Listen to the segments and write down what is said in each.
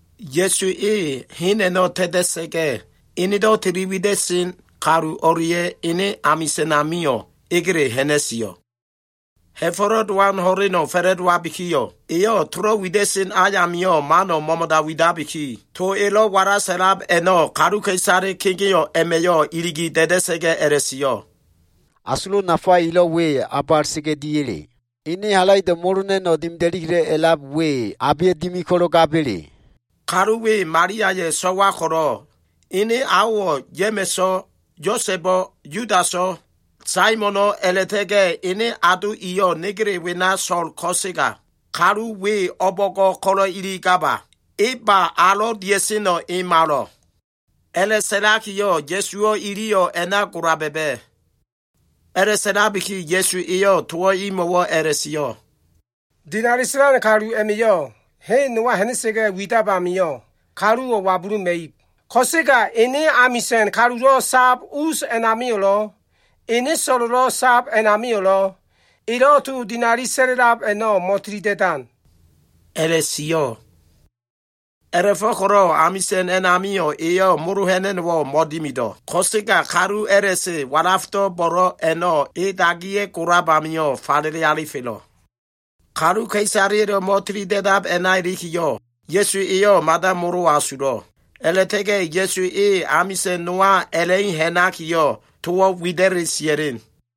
Ya꞉su e hen a꞉no꞉ ta꞉ta꞉sa꞉ga꞉, enedo꞉ tili wida꞉sen kalu o꞉lia꞉ ene amisa꞉n amio꞉ egele ha꞉na꞉sio꞉. Ha꞉fo꞉lo꞉ Dowan ho꞉leno꞉ fa꞉la꞉dowabikiyo꞉, eyo꞉ tolo꞉ wida꞉sen ayamio꞉ mano꞉ mo꞉mo꞉da widabiki, to elo꞉ walasa꞉la꞉lab a꞉no꞉ kaluka꞉isale kegeo꞉ a꞉ma꞉yo꞉ iligi da꞉da꞉sa꞉ga꞉ a꞉la꞉sio꞉, “Asulo꞉ nafa elo꞉ we, o꞉ba a꞉la꞉ta꞉ga꞉ dia꞉le? Ene halaido꞉ molo ha꞉na꞉no꞉ dimida꞉li a꞉lab we, abe dimi ko꞉lo꞉ gaba꞉le? Kalu we Maliaya꞉ so꞉wa ko꞉lo꞉, ene aowo꞉ Ya꞉ma꞉so꞉, Yosa꞉bo꞉, Yudaso꞉, Saimono꞉ a꞉la꞉ta꞉ga꞉ ene ado iyo꞉ negele wena so꞉l ko꞉sega, kalu we o꞉bo꞉ngo꞉ ko꞉lo꞉ iligaba? E ba alo꞉ dia꞉seno꞉, e malo꞉.” A꞉la꞉sa꞉lakiyo꞉ Ya꞉suwo꞉ iliyo꞉ a꞉na gola ba꞉ba꞉. A꞉la꞉sa꞉la꞉labiki Ya꞉su eyo꞉ towo꞉ imo꞉wo꞉ a꞉la꞉sio꞉, “Dinali sa꞉lan kalu a꞉ma꞉yo꞉ hen nowa ha꞉na꞉sa꞉ga꞉ widab a꞉namio꞉ kaluka꞉isaleya꞉yo꞉ wabuluma꞉ib, ko꞉sega ene amisa꞉n kalulo꞉ sab us a꞉namio꞉lo꞉, ene so꞉lo꞉ sab a꞉namio꞉lo꞉, elo꞉ to dinali sa꞉la꞉lab a꞉no꞉ mo꞉tilida꞉da꞉sen,” a꞉la꞉sio꞉. A꞉la꞉fo꞉ko꞉lo꞉ amisa꞉n a꞉namio꞉, eyo꞉ molo ha꞉na꞉no꞉wo꞉ mo꞉dimido꞉. Ko꞉sega kalu a꞉la꞉se walafdo꞉ bo꞉lo꞉ a꞉no꞉ e dagiya꞉ golab amio꞉ falele alifelo꞉. Kaluka꞉isaleya꞉lo꞉ mo꞉tilida꞉dab a꞉na ilikiyo꞉, Ya꞉su eyo꞉ mada molo asulo꞉. A꞉la꞉ta꞉ga꞉ Ya꞉su e amisa꞉n nowa a꞉la꞉i ha꞉nakiyo꞉, towo꞉ wida꞉li sia꞉len.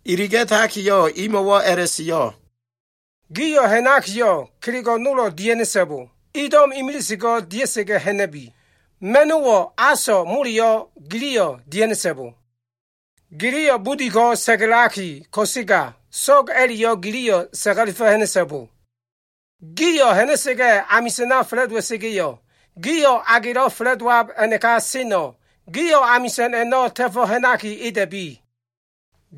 Iliga꞉takiyo꞉, imo꞉wo꞉ a꞉la꞉sio꞉, “Gio꞉ ha꞉nakiyo꞉ kelego꞉ nolo꞉ dia꞉ha꞉na꞉so꞉bo, ido꞉m imilise ko dia꞉sa꞉ga꞉ ha꞉na꞉bi. Ma꞉no꞉wo꞉, aso꞉, moleyo꞉ giliyo꞉ dia꞉ha꞉na꞉so꞉bo. Giliyo꞉ budi ko꞉ sa꞉ga꞉laki ko꞉sega, so꞉go꞉ a꞉la꞉yo꞉ giliyo꞉ sa꞉ga꞉lefo꞉ ha꞉na꞉so꞉bo. Gio꞉ ha꞉na꞉sa꞉ga꞉, amisa꞉na fa꞉la꞉dowa꞉sa꞉ga꞉yo꞉, gio꞉ a gelo꞉ fa꞉la꞉dowab a꞉naka seno꞉, gio꞉ amisa꞉n a꞉no꞉ ta꞉fo꞉ ha꞉naki, eda꞉bi.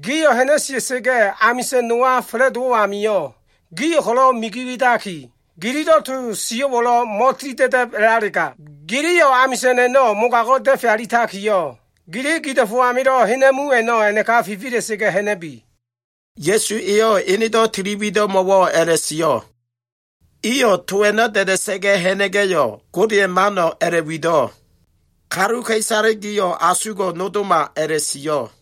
Gio꞉ ha꞉na꞉sia꞉sa꞉ga꞉ amisa꞉n nowa fa꞉la꞉dowo꞉ amio꞉, gio꞉ ko꞉lo꞉ migi widaki, gililo꞉ to sio꞉wo꞉lo꞉ mo꞉tilida꞉da꞉b a꞉lalega, giliyo꞉ amisa꞉n a꞉no꞉ mogago꞉ da꞉fe alitakiyo꞉, gili gido꞉fo꞉ amilo꞉ hena꞉mu a꞉no꞉ a꞉naka fifila꞉sa꞉ga꞉ ha꞉na꞉bi.” Ya꞉su eyo꞉ enedo꞉ tili wido꞉mo꞉wo꞉ a꞉la꞉wida꞉sen. Iyo꞉ to a꞉no꞉ da꞉da꞉sa꞉ga꞉ ha꞉na꞉ga꞉yo꞉, Godeya꞉ mano꞉ a꞉la꞉wido꞉, “Kaluka꞉isale gio꞉ asugo꞉ nodoma” a꞉la꞉sio꞉.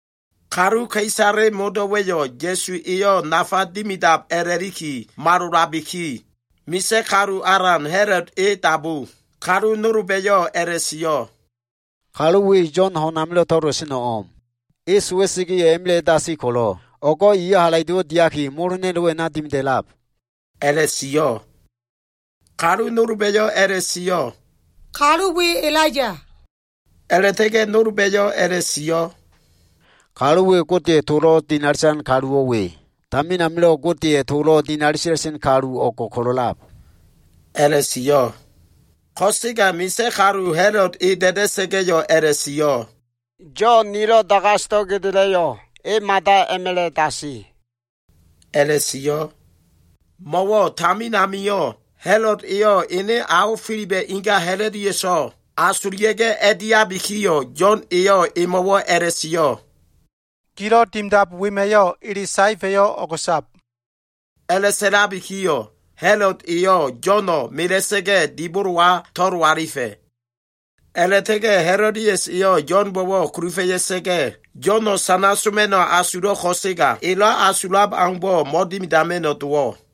Kaluka꞉isale modo꞉wa꞉yo꞉ Ya꞉su eyo꞉ nafa dimidab a꞉la꞉liki malolabiki, misa꞉ kalu alan Ha꞉lod e dabu. Kalu nolba꞉yo꞉ a꞉la꞉sio꞉, “Kalu we Yo꞉n ho꞉n amilo꞉ to꞉lola꞉seno꞉ o꞉m. E sowa꞉sa꞉ga꞉yo꞉, a꞉ma꞉la꞉ a꞉dasi ko꞉lo꞉, o꞉go꞉ eyo꞉ halaido꞉wo꞉ diaki, molo ha꞉na꞉no꞉wo꞉ a꞉na dimida꞉lab,” a꞉la꞉sio꞉. Kaluka꞉isale nolba꞉yo꞉ a꞉la꞉sio꞉, “Kalu we Elaiya.” A꞉la꞉ta꞉ga꞉ nolba꞉yo꞉ a꞉la꞉sio꞉, “Kalu we, Godeya꞉ tolo꞉ dinali sa꞉lan kaluwo꞉ we. Tamin amilo꞉ Godeya꞉ tolo꞉ dinali sa꞉la꞉sen kalu o꞉ngo꞉ ko꞉lo꞉ a꞉lab” a꞉la꞉sio꞉. Ko꞉sega misa꞉ kalu Ha꞉lod e da꞉da꞉sa꞉ga꞉yo꞉ a꞉la꞉sio꞉, “Yo꞉n nilo꞉ dagasdo꞉ gedela꞉yo꞉, e mada a꞉ma꞉la꞉ dasi,” a꞉la꞉sio꞉. Mo꞉wo꞉ tamin amio꞉, Ha꞉lod eyo꞉ ene ao Filiba꞉ inga Ha꞉lodiaso꞉ asulia꞉ga꞉ a꞉diabikiyo꞉, Yo꞉n eyo꞉ emo꞉wo꞉ a꞉la꞉sio꞉, “Gilo꞉ dimidab wema꞉yo꞉ ele saefa꞉yo꞉ o꞉go꞉sab.” A꞉la꞉sa꞉labikiyo꞉, Ha꞉lod eyo꞉ Yo꞉no꞉ mela꞉sa꞉ga꞉ dibolowa to꞉lo alifa꞉. A꞉la꞉ta꞉ga꞉ Ha꞉lodias eyo꞉ Yo꞉nbo꞉wo꞉ kulufa꞉ya꞉sa꞉ga꞉, Yo꞉no꞉ sana soma꞉no꞉ asulo꞉ ko꞉sega, elo꞉ asulo꞉ aumbo꞉ mo꞉dimidama꞉no꞉ dowo꞉.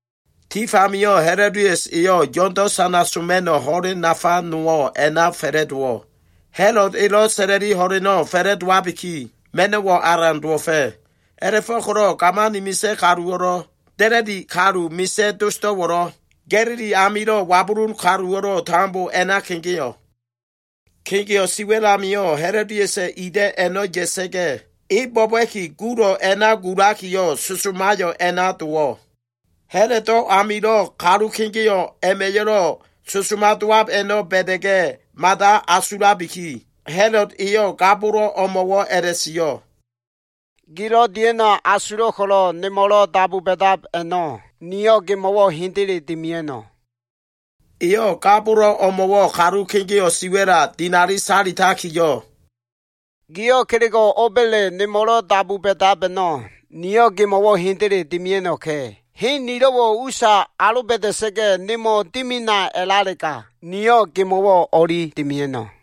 Tif amio꞉ Ha꞉lodias eyo꞉ Yo꞉ndo꞉ sana soma꞉no꞉ ho꞉len nafa nowo꞉ a꞉na fa꞉la꞉dowo꞉. Ha꞉lod elo꞉ sa꞉la꞉li ho꞉leno꞉ fa꞉la꞉dowabiki, ma꞉no꞉wo꞉ alan dowo꞉fa꞉. A꞉la꞉fo꞉ko꞉lo꞉ gamani misa꞉ kaluwo꞉lo꞉, da꞉la꞉di kalu misa꞉ dosdo꞉wo꞉lo꞉, Ga꞉lili amilo꞉ wabulun kaluwo꞉lo꞉ tambo a꞉na kegeo꞉. Kegeo꞉ siwa꞉l amio꞉ Ha꞉lodiasa꞉ ida꞉ a꞉no꞉ ya꞉sa꞉ga꞉, e bo꞉ba꞉ki gulo꞉ a꞉na gulakiyo꞉ sosomayo꞉ a꞉na dowo꞉. Ha꞉lodo꞉ amilo꞉ kalu kegeo꞉ a꞉ma꞉yo꞉lo꞉ sosoma dowab a꞉no꞉ ba꞉da꞉ga꞉, mada asulabiki, Ha꞉lod eyo꞉ ga bolo꞉ o꞉mo꞉wo꞉ a꞉la꞉sio꞉, “Gilo꞉ dia꞉no꞉ asulo꞉ ko꞉lo꞉ nemo꞉lo꞉ dabu ba꞉dab a꞉no꞉, niyo꞉ gemo꞉wo꞉ hendele dimia꞉no꞉.” Eyo꞉ ga bolo꞉ o꞉mo꞉wo꞉ kalu kegeo꞉ siwa꞉la dinali sa꞉lakiyo꞉, “Giyo꞉ kelego꞉ o꞉ba꞉le nemo꞉lo꞉ dabu ba꞉dab a꞉no꞉, niyo꞉ gemo꞉wo꞉ hendele dimia꞉no꞉ka꞉. Hen nilo꞉wo꞉ usa aloba꞉da꞉sa꞉ga꞉ nemo꞉ dimina a꞉lalega, niyo꞉ gemo꞉wo꞉ o꞉li dimia꞉no꞉.”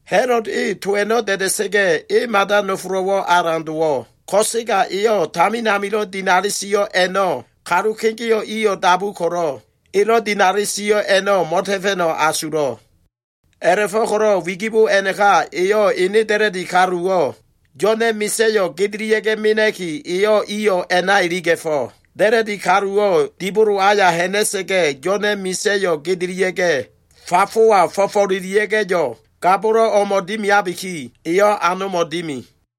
Ha꞉lod e to a꞉no꞉ da꞉da꞉sa꞉ga꞉, e mada nofolo꞉wo꞉ alan dowo꞉, ko꞉sega eyo꞉ tamin amilo꞉ dinali sio꞉ a꞉no꞉ kalu kegeo꞉ iyo꞉ dabu ko꞉lo꞉ elo꞉ dinali sio꞉ a꞉no꞉ mo꞉ta꞉fa꞉no꞉ asulo꞉. A꞉la꞉fo꞉ko꞉lo꞉ wigibo a꞉naka eyo꞉ ene da꞉la꞉di kaluwo꞉ Yo꞉na꞉ misa꞉yo꞉ gedelia꞉ga꞉ mena꞉ki, eyo꞉ iyo꞉ a꞉na iliga꞉fo꞉. Da꞉la꞉di kaluwo꞉ dibolo aya ha꞉na꞉sa꞉ga꞉, Yo꞉na꞉ misa꞉yo꞉ gedelia꞉ga꞉, fafowa fo꞉fo꞉lelia꞉ga꞉yo꞉, ga bolo꞉ o꞉mo꞉ dimiabiki, eyo꞉ anomo꞉ dimi.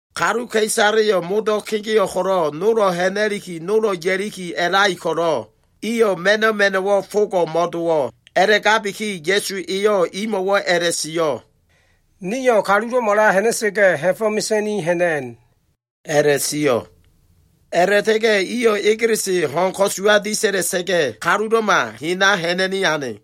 Kaluka꞉isaleyo꞉ modo꞉ kegeo꞉ ko꞉lo꞉ nolo꞉ ha꞉na꞉liki, nolo꞉ ya꞉liki a꞉lai ko꞉lo꞉, iyo꞉ ma꞉no꞉ ma꞉no꞉wo꞉ fogo꞉ mo꞉dowo꞉. A꞉la꞉gabiki Ya꞉su eyo꞉ imo꞉wo꞉ a꞉la꞉sio꞉, “Nio꞉ kalulo꞉mala ha꞉na꞉sa꞉ga꞉, ha꞉fo꞉ mesa꞉ni ha꞉na꞉n” a꞉la꞉sio꞉. A꞉la꞉ta꞉ga꞉ iyo꞉ egelese ho꞉n ko꞉suwa disa꞉la꞉sa꞉ga꞉, kalulo꞉ma hena ha꞉na꞉ni ane.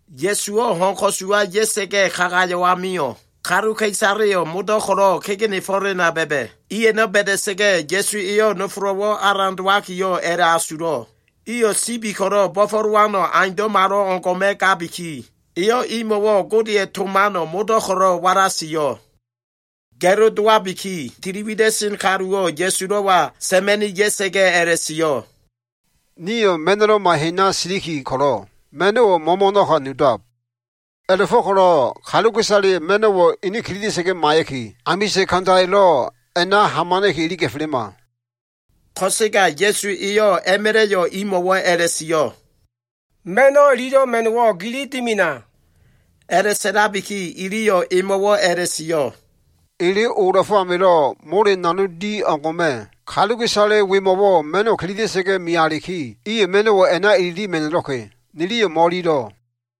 Ya꞉suwo꞉ ho꞉n ko꞉suwa ya꞉sa꞉ga꞉ kagayo꞉ amio꞉, kaluka꞉isaleyo꞉ modo꞉ ko꞉lo꞉ kegenefo꞉lena ba꞉ba꞉. I a꞉no꞉ ba꞉da꞉sa꞉ga꞉, Ya꞉su eyo꞉ nofolo꞉wo꞉ alan dowakiyo꞉ a꞉la꞉asulo꞉, iyo꞉ sibi ko꞉lo꞉ bo꞉fo꞉lowano꞉ aundo꞉malo꞉ngo꞉ma꞉ gabiki, eyo꞉ imo꞉wo꞉ Godeya꞉ to mano꞉ modo꞉ ko꞉lo꞉ walasio꞉. Ga꞉lo dowabiki, tiliwida꞉sen kaluwo꞉ Ya꞉sulo꞉wa sa꞉ma꞉ni ya꞉sa꞉ga꞉ a꞉la꞉sio꞉, “Nio꞉ ma꞉no꞉loma hena siliki ko꞉lo꞉, ma꞉no꞉wo꞉ mo꞉mo꞉no꞉ka nudab. A꞉la꞉fo꞉ko꞉lo꞉ kaluka꞉isaleyo꞉ ma꞉no꞉wo꞉ ini kililia꞉sa꞉ga꞉ maiya꞉ki, amisa꞉n kandayo꞉lo꞉ a꞉na tambo iliga꞉felema.” Ko꞉sega Ya꞉su eyo꞉ a꞉ma꞉la꞉yo꞉ imo꞉wo꞉ a꞉la꞉sio꞉, “Ma꞉no꞉ ililo꞉ ma꞉no꞉wo꞉ gili dimina.” A꞉la꞉sa꞉labiki iliyo꞉ emo꞉wo꞉ a꞉la꞉sio꞉, “Ele ola꞉fo꞉ amilo꞉ mole nanog di o꞉ngo꞉ma꞉, kaluka꞉isale wemo꞉wo꞉ ma꞉no꞉wo꞉ kililia꞉sa꞉ga꞉ mealiki, iyo꞉ ma꞉no꞉wo꞉ a꞉na ililima꞉no꞉lo꞉ka꞉. Niliyo꞉ mo꞉ililo꞉.”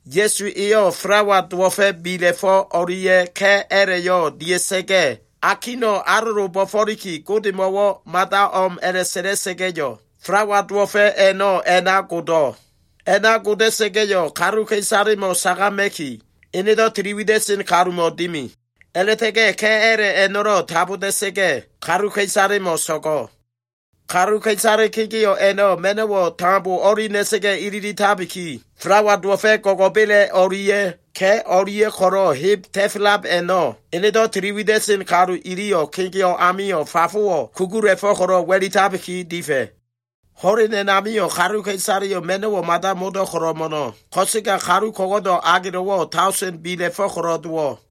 Ya꞉su eyo꞉ falawa dowo꞉fa꞉ bila꞉fo꞉ o꞉lia꞉ ka꞉ a꞉la꞉yo꞉ dia꞉sa꞉ga꞉, akino꞉ alolo bo꞉fo꞉liki, Godemo꞉ mada o꞉m a꞉la꞉sa꞉la꞉sa꞉ga꞉yo꞉, falawa dowo꞉fa꞉ a꞉no꞉ a꞉na godo꞉. A꞉na goda꞉sa꞉ga꞉yo꞉, kaluka꞉isalemo꞉ sagama꞉ki, enedo꞉ tiliwida꞉sen kalumo꞉ dimi. A꞉la꞉ta꞉ga꞉ ka꞉ a꞉la꞉ a꞉no꞉lo꞉ taboda꞉sa꞉ga꞉, kaluka꞉isalemo꞉ so꞉go꞉. Kaluka꞉isale kegeo꞉ a꞉no꞉ ma꞉no꞉wo꞉ tambo o꞉li na꞉sa꞉ga꞉ ililitabiki, falawa dowo꞉fa꞉ go꞉go꞉bela꞉ o꞉lia꞉ ka꞉ o꞉lia꞉ ko꞉lo꞉ heb ta꞉felab a꞉no꞉, enedo꞉ tili wida꞉sen kalu iliyo꞉ kegeo꞉ amio꞉ fafowo꞉ kugula꞉fo꞉ ko꞉lo꞉ wa꞉litabi difa꞉. Ho꞉len a꞉namio꞉ kaluka꞉isaleyo꞉ ma꞉no꞉wo꞉ mada modo꞉ ko꞉lo꞉ mo꞉no꞉, ko꞉sega kalu ko꞉go꞉do꞉ agelo꞉wo꞉, daosen bila꞉fo꞉ ko꞉lo꞉ dowo꞉.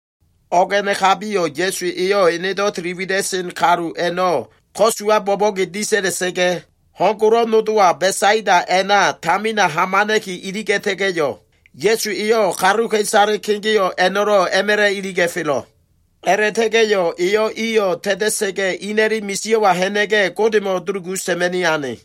O꞉g a꞉nakabiyo꞉ Ya꞉su eyo꞉ enedo꞉ tili wida꞉sen kalu a꞉no꞉ ko꞉suwa bo꞉bo꞉ge disa꞉la꞉sa꞉ga꞉, ho꞉n golo꞉ nodowa Besaida a꞉na tamina hamana꞉ki iliga꞉ta꞉ga꞉yo꞉, Ya꞉su eyo꞉ kaluka꞉isale kegeo꞉ a꞉no꞉lo꞉ a꞉ma꞉la꞉ iliga꞉felo꞉. A꞉la꞉ta꞉ga꞉yo꞉ eyo꞉ iyo꞉ ta꞉ta꞉sa꞉ga꞉, ina꞉li misio꞉wa ha꞉na꞉ga꞉, Godemo꞉ dulugu sa꞉ma꞉ni ane.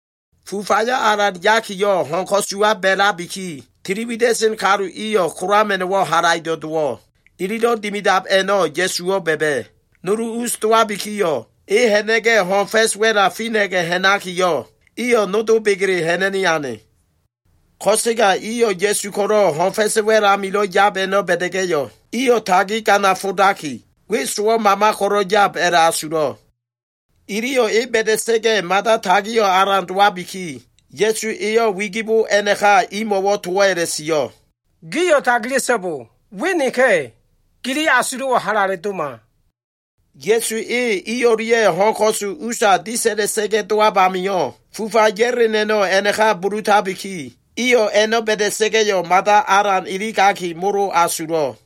Fufayo꞉ alan yakiyo꞉, ho꞉n ko꞉suwa ba꞉labiki, tiliwida꞉sen iyo꞉ kolama꞉no꞉wo꞉ halaido꞉ dowo꞉. Ililo꞉ dimidab a꞉no꞉ Ya꞉suwo꞉ ba꞉ba꞉. Nulu us dowabikiyo꞉, e ha꞉na꞉ga꞉ ho꞉n fa꞉s wa꞉la fina꞉ga꞉ ha꞉nakiyo꞉, iyo꞉ nodo begele ha꞉na꞉ni ane. Ko꞉sega iyo꞉ Ya꞉su ko꞉lo꞉ ho꞉n fa꞉s wa꞉l amilo꞉ yab a꞉no꞉ ba꞉da꞉ga꞉yo꞉, iyo꞉ tagi ganafo꞉daki, we sowo꞉ mama ko꞉lo꞉ yab a꞉la꞉asulo꞉. Iliyo꞉ e ba꞉da꞉sa꞉ga꞉ mada tagio꞉ alan dowabiki, Ya꞉su eyo꞉ wigibo a꞉naka imo꞉wo꞉ towo꞉ a꞉la꞉sio꞉, “Gio꞉ tagila꞉so꞉bo. We neka꞉! Gili asulo꞉wo꞉ halale doma.” Ya꞉su e i o꞉lia꞉ ho꞉n ko꞉su usa disa꞉la꞉sa꞉ga꞉ dowab amio꞉, fufa ya꞉len a꞉no꞉ a꞉naka bulutabiki, iyo꞉ a꞉no꞉ ba꞉da꞉sa꞉ga꞉yo꞉ mada alan iligaki molo asulo꞉.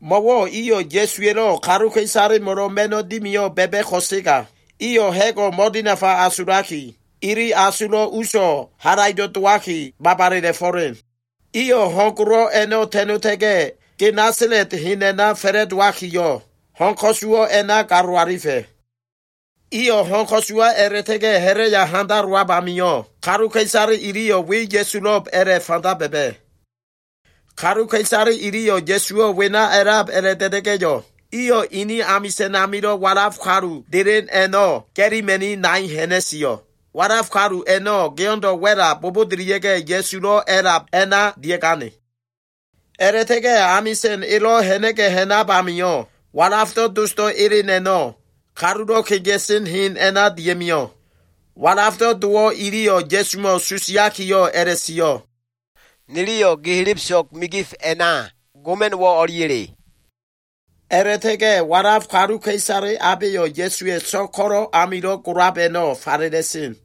Mo꞉wo꞉ iyo꞉ Ya꞉suwa꞉lo꞉ kaluka꞉isalemo꞉lo꞉ ma꞉no꞉ dimiyo꞉ ba꞉ba꞉ ko꞉sega, iyo꞉ ha꞉go꞉ mo꞉dinafa asulaki, ili asulo꞉ uso꞉ halaido꞉ dowaki, babalela꞉fo꞉len. Iyo꞉ ho꞉n golo꞉ a꞉no꞉ ta꞉nota꞉ga꞉, Genesalet hen a꞉na fa꞉la꞉dowakiyo꞉, ho꞉n ko꞉suwo꞉ a꞉na galo alifa꞉. Iyo꞉ ho꞉n ko꞉suwa a꞉la꞉ta꞉ga꞉ ha꞉la꞉ya handalowab amio꞉, kaluka꞉isale iliyo꞉ we Ya꞉sulo꞉b a꞉la꞉fanda ba꞉ba꞉. Kaluka꞉isale iliyo꞉ Ya꞉suwo꞉ wena a꞉lab a꞉la꞉da꞉da꞉ga꞉yo꞉, iyo꞉ ini amisa꞉n amilo꞉ walaf kalu delen a꞉no꞉ ga꞉lima꞉ni nai ha꞉na꞉sio꞉. Walaf kalu a꞉no꞉ geo꞉ndo꞉ wa꞉la bobodolia꞉ga꞉, Ya꞉sulo꞉ a꞉lab a꞉na dia꞉gane. A꞉la꞉ta꞉ga꞉ amisa꞉n elo꞉ ha꞉na꞉ga꞉ ha꞉nab amio꞉, walafdo꞉ dosdo꞉ elen a꞉no꞉ kalulo꞉ kegea꞉sen hen a꞉na dia꞉mio꞉. Walafdo꞉ dowo꞉ iliyo꞉ Ya꞉sumo꞉ susiakiyo꞉ a꞉la꞉sio꞉, “Niliyo꞉ gi helebeso꞉g migif kona goma꞉no꞉wo꞉ o꞉liya꞉le?” A꞉la꞉ta꞉ga꞉ walaf kaluka꞉isale abeyo꞉ Ya꞉suwa꞉ so꞉g ko꞉lo꞉ amilo꞉ golab a꞉no꞉ falela꞉sen.